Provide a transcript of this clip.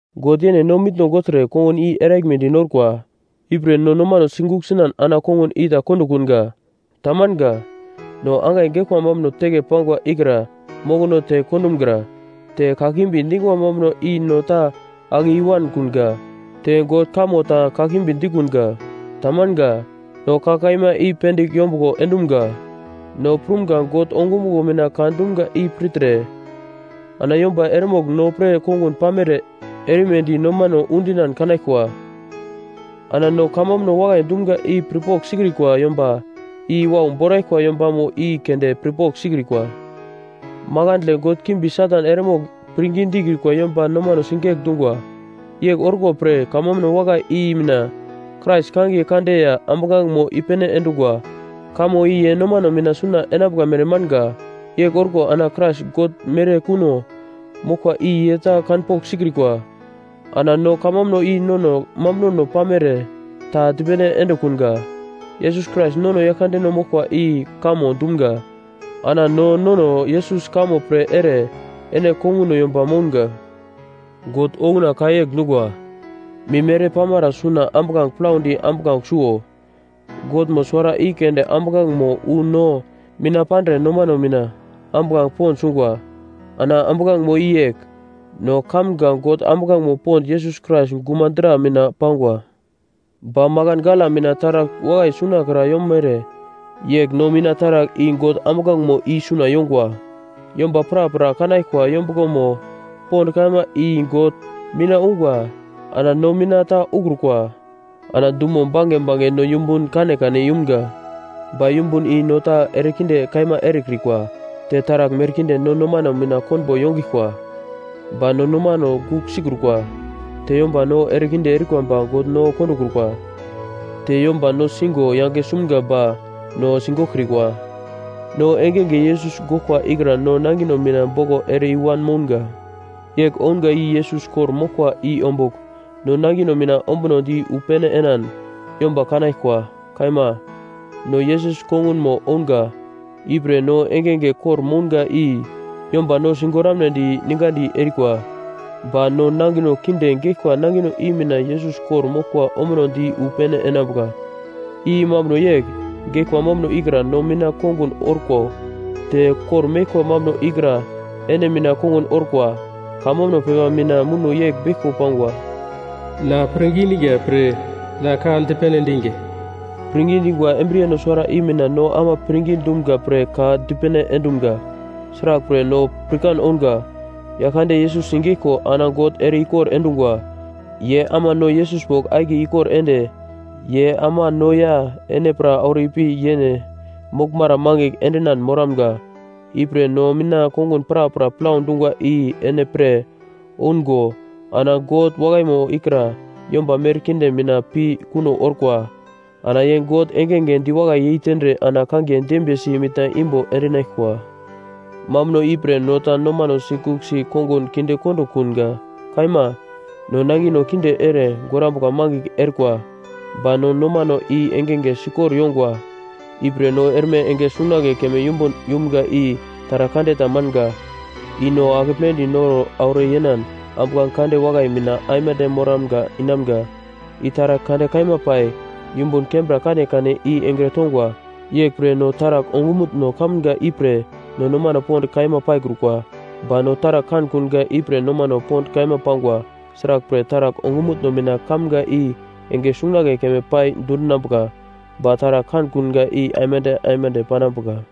God yene no mitno gogltre kongun i eraglmedi norkwa. Ipre no nomano sigugl sinan ana kongun i ta kondokunga. Tamanga. No angai geglkwa mambuno teke pangwa ikra mokono te kondumgra. Te kakimbi dingwa mambuno i no ta ake i-wankunga, te God kamo ta kakimbi dikunga, tamanga. No ka kaima i pendigl yombuglo endumga, no prumga God ongumuglo mina ka dumga i pirtre ana yomba eremogl no pre kongun pamere erimedi nomano undinan kanaglkwa. Ana no kamambuno wakai dumga i pirpogl sikrikwa yomba i wau boraglkwa yombamo i keunde pirpogl sikrikwa. Makandle god kimbi Satan eremogl pirngi dikrikwa yomba nomano sigegl dungwa. Yegl orkwa pre kamambuno wakai i mina Krais kangiye kande ya ambuglangemo i-pene endungwa, kamo i ye nomano mina suna enambuka mere manga. Yegl orko ana Krais God mere kuno moglkwa i ye ta kanpogl sikrikwa. Ana no kamambuno i no nono mambunono pamere ta dipene endekunga, Yesus Krais nono Yaglkandeno moglkwa i kamo dumga, ana no nono Yesus kamo pre ere ene konguno yomba mounga. God okuna ka yegl dungwa, “Mim ere pamara suna ambuglange plaudi ambuglange suo.” Godmo suwara i keunde ambuglangemo wu no mina pandre nomano mina ambuglange pond sungwa. Ana ambuglangemo i yegl: No kamga God ambuglangemo pond Yesus Krais guma dra mina pangwa. Ba makan gala mina taragl wakai sunakra yomere yegl no mina taragl i God ambuglangemo i suna yongwa. Yomba prapra kanaglkwa yombuglomo pond kaima i God mina ungwa ana no mina ta ukrukwa. Ana dumo bange bange no yumbun kanekane yumga, ba yumbun i no ta erekinde kaima erekrikwa, te taragl merkinde no nomano mina konbo yongiglkwa, ba no nomano gugl sikrukwa, te yomba no ere kinde erikwa ba God no kondokrukwa, te yomba no sigo yange sumga ba no sigoglkrikwa. No engenge Yesus goglkwa ikra no nangino mina boglo ere i-wan mounga. Yegl ounga i Yesus kor-moglkwa i ombugl no nangino mina ombunodi wu pene enan yomba kanaglkwa. Kaima, no Yesus kongunmo ounga, ipre no engenge kor-mounga i yomba no sigoramnedi ningadi erikwa. Ba no nangino kinde geglkwa nangino i mina Yesus kor-moglkwa ombunodi wu pene enambuka. I mambuno yegl, geglkwa mambuno ikra no mina kongun orko, te kor-meglkwa mambuno ikra ene mina kongun orkwa. Kamambuno pepa mina muno yegl beglko pangwa, “Na pirngi diga pre na ka dipene endinga.” Pirngi dingwa embriyeno suwara i mina no ama pirngi dumga pre ka dipene endumga. Sraglpre, no pirkan ounga, Yaglkande Yesus sigeglko ana God ere-ikor endungwa. Ye ama no Yesus bogl akiye ikor ende, ye ama no ya ene pra auro ipi yene moglmara mangigl endinan moramga. Ipre, no mina kongun prapra plau dungwa i ene pre oungo ana God wakaimo ikra yomba merkinde mina pi kuno orkwa. Ana ye God engenge diwakai yeitendre ana kangiye dembiyesi mitna imbo endinaglkwa. Mambuno ipre no ta nomano sigugl si kongun kindekondo kunga. Kaima, no nangino kinde ere gorambuka mangigl orkwa, ba no nomano i engenge sikor yongwa. Ipre no erme enge sungunagle keme yumbun yumga i taragl kande tamanga, i no akepledi noro auro yenan ambuglange kande wakai mina aimande moramga inamga, i taragl kande kaima pai yumbun kembra kanekane i engre tongwa. Yeglpre no taragl ongumutno kamga ipre no nomano pond kaima paikrukwa, ba no taragl kankunga ipre nomano pond kaima pangwa. Sraglpre, taragl ongumutno mina kamga i enge sungunagle keme pai dundungwa, ba taragl kankunga i aimande aimande panambuka.